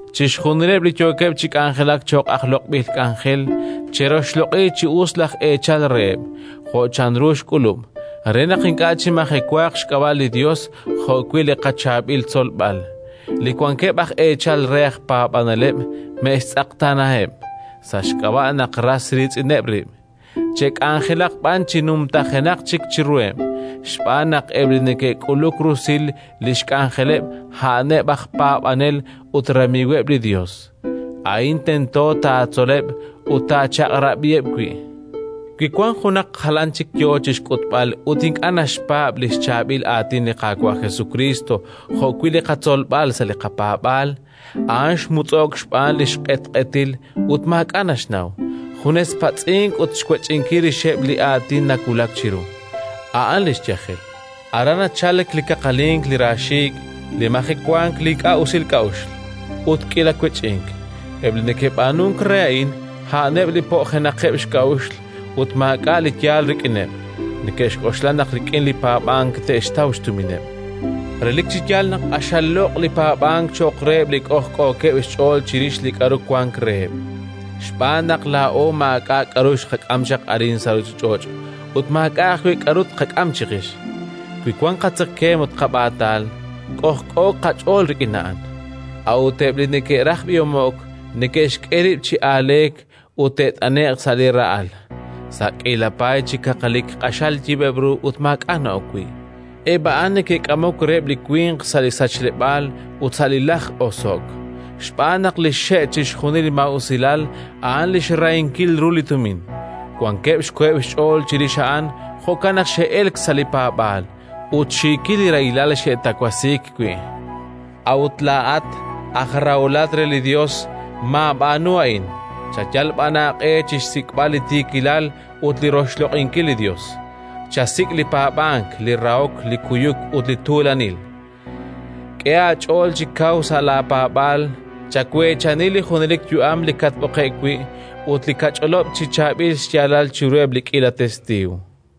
Chixjunileb' li yookeb' chi k'anjelak cho'q aj loq'b'il k'anjel che'roxloq'i chi us laj eechal reheb' jo' chanru xk'ulub', re naq ink'a' chimajewaaq xk'ab'a' li Yos jo'wi' li qachaab'il tzolb'al. Li wankeb' aj eechal re aj paab'aneleb' me'xtz'eqtaanaheb', sa' xk'ab'a' naq ras riitz'ineb' rib', che'k'anjelaq b'an chi numtajenaq chik chiruheb', xb'aan naq eb' li neke'k'uluk rusil li xk'anjeleleb' a'aneb' aj paab'anel ut ramiiweb' li Yos. Li tz'aqal aj tij ut laj b'alaq' A'in tento taatzoleb' ut taachaq'rab'iheb' wi': Wi wank junaq jalan chik yo chi xk'utb'al ut ink'a' naxpaab' li xchaab'il aatin li Qaawa' Jesukriist jo'wi' li qatzolb'al sa' li qapaab'aal, a'an xmutz'o'k xb'aan li xq'etq'etil ut maak'a' naxnaw; junes patz'ink ut xwech'inkil rixeb' li aatin nawulak chiru. A'an li xyajel. Aran nachalk li kaqalink, li raaxiik', li majewank, li ink'a' usil k'a'uxl ut k'iila wech'ink: eb' li neke'b'aanunk re a'in, a'aneb' li po'jenaqeb' xk'a'uxl, ut maak'a' li yaal rik'ineb'; neke'xk'oxla naq rik'in li paab'ank te'xtaw xtumineb'. Relik chi yaal naq q'axal loq' li paab'ank cho'q reheb' li k'ojk'ookeb' xch'ool chirix li k'aru wank reheb'. Xb'aan naq laa'o maak'a' k'aru xqak'am chaq arin sa' ruuchich'och' ut maak'a' ajwi' k'aru tqak'am chiqix. Wi wank qatzekemq ut qab'aatal, k'ojk'ooq qach'ool rik'in a'an. A'ut eb' li neke'raj b'ihomo'k, neke'xk'e rib' chi aaleek ut te't'ane'q sa' li ra'al, sa' k'iila paay chi kaqalik q'axal yib'eb' ru ut maak'a' na'ok wi': eb' a'an neke'k'amok reheb' li winq sa' li sachleb'aal ut sa' li lajk-oso'k. Xb'aan naq li xxe' chixjunil li maa'usilal a'an li xrahinkil ru li tumin. Wankeb' xkoheb' xch'ool chirix a'an; jo'kan naq xe'elk sa' li paab'aal, ut xiikil li rahilal xe'tawasiik wi'. A'ut laa'at aj raholat re li Yos, maab'aanu a'in; chayal b'an aaq'e chi xsik'b'al li tiikilal ut li roxloq'inkil li Yos; chasik' li paab'ank, li rahok, li kuyuk ut li tuulanil. K'e aach'ool chi kaw sa' laapaab'aal, chaweechani li junelik yu'am li katb'oqe'k wi' ut li kach'olob' chi chaab'il xyaalal chiruheb' li k'iila testiiw.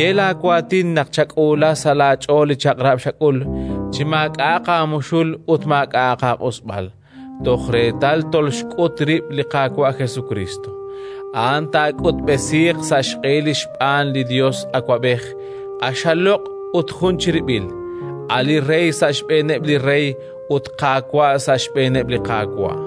ye laawaatin naq chak'uula sa' laach'ool li chaq'rab' xak'ul, chi maak'a'aq aamuxul ut maak'a'aq aaq'usb'al, toj reetal tolxk'ut rib' li Qaawa' Jesukriist. A'an taak'utb'esiiq sa' xq'ehil xb'aan li Yos Awab'ej, q'axal loq' ut jun chirib'il, a' li Rey sa' xb'eeneb' li rey ut Qaawa' sa' xb'eeneb' li Qaawa',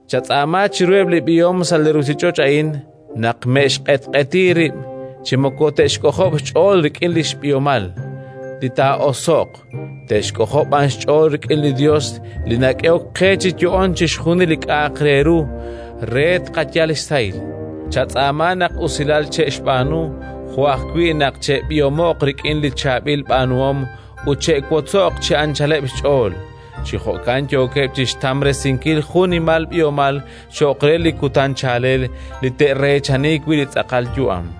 Chatz'aama chiruheb' li b'ihom sa' li ruuchich'och' a'in naq me'xq'etq'eti rib' chi moko te'xk'ojob' xch'ool rik'in li b'ihomal li taa'oso'q, te'xk'ojob' b'an xch'ool rik'in li Yos li nak'ehok qe chi yo'oon chixjunil li k'a'aq re ru, re tqayal xsahil. Chatz'aama naq usilal che'xb'aanu, jo' ajwi' naq che'b'ihomo'q rik'in li chaab'il b'aanuhom ut che'wotzoq chi anchaleb' xch'ool. Chi jo'kan yooqeb' chi xtamresinkil jun xnimal b'ihomal cho'q re li kutan chaalel li te'reechani wi' li tz'aqal yu'am.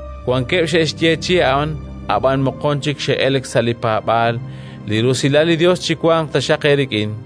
Wankeb' xe'xyeechi'i a'an, ab'an moqon chik xe'elk sa' li paab'aal. Li rusilal li Yos chiwanq taxaq eerik'in.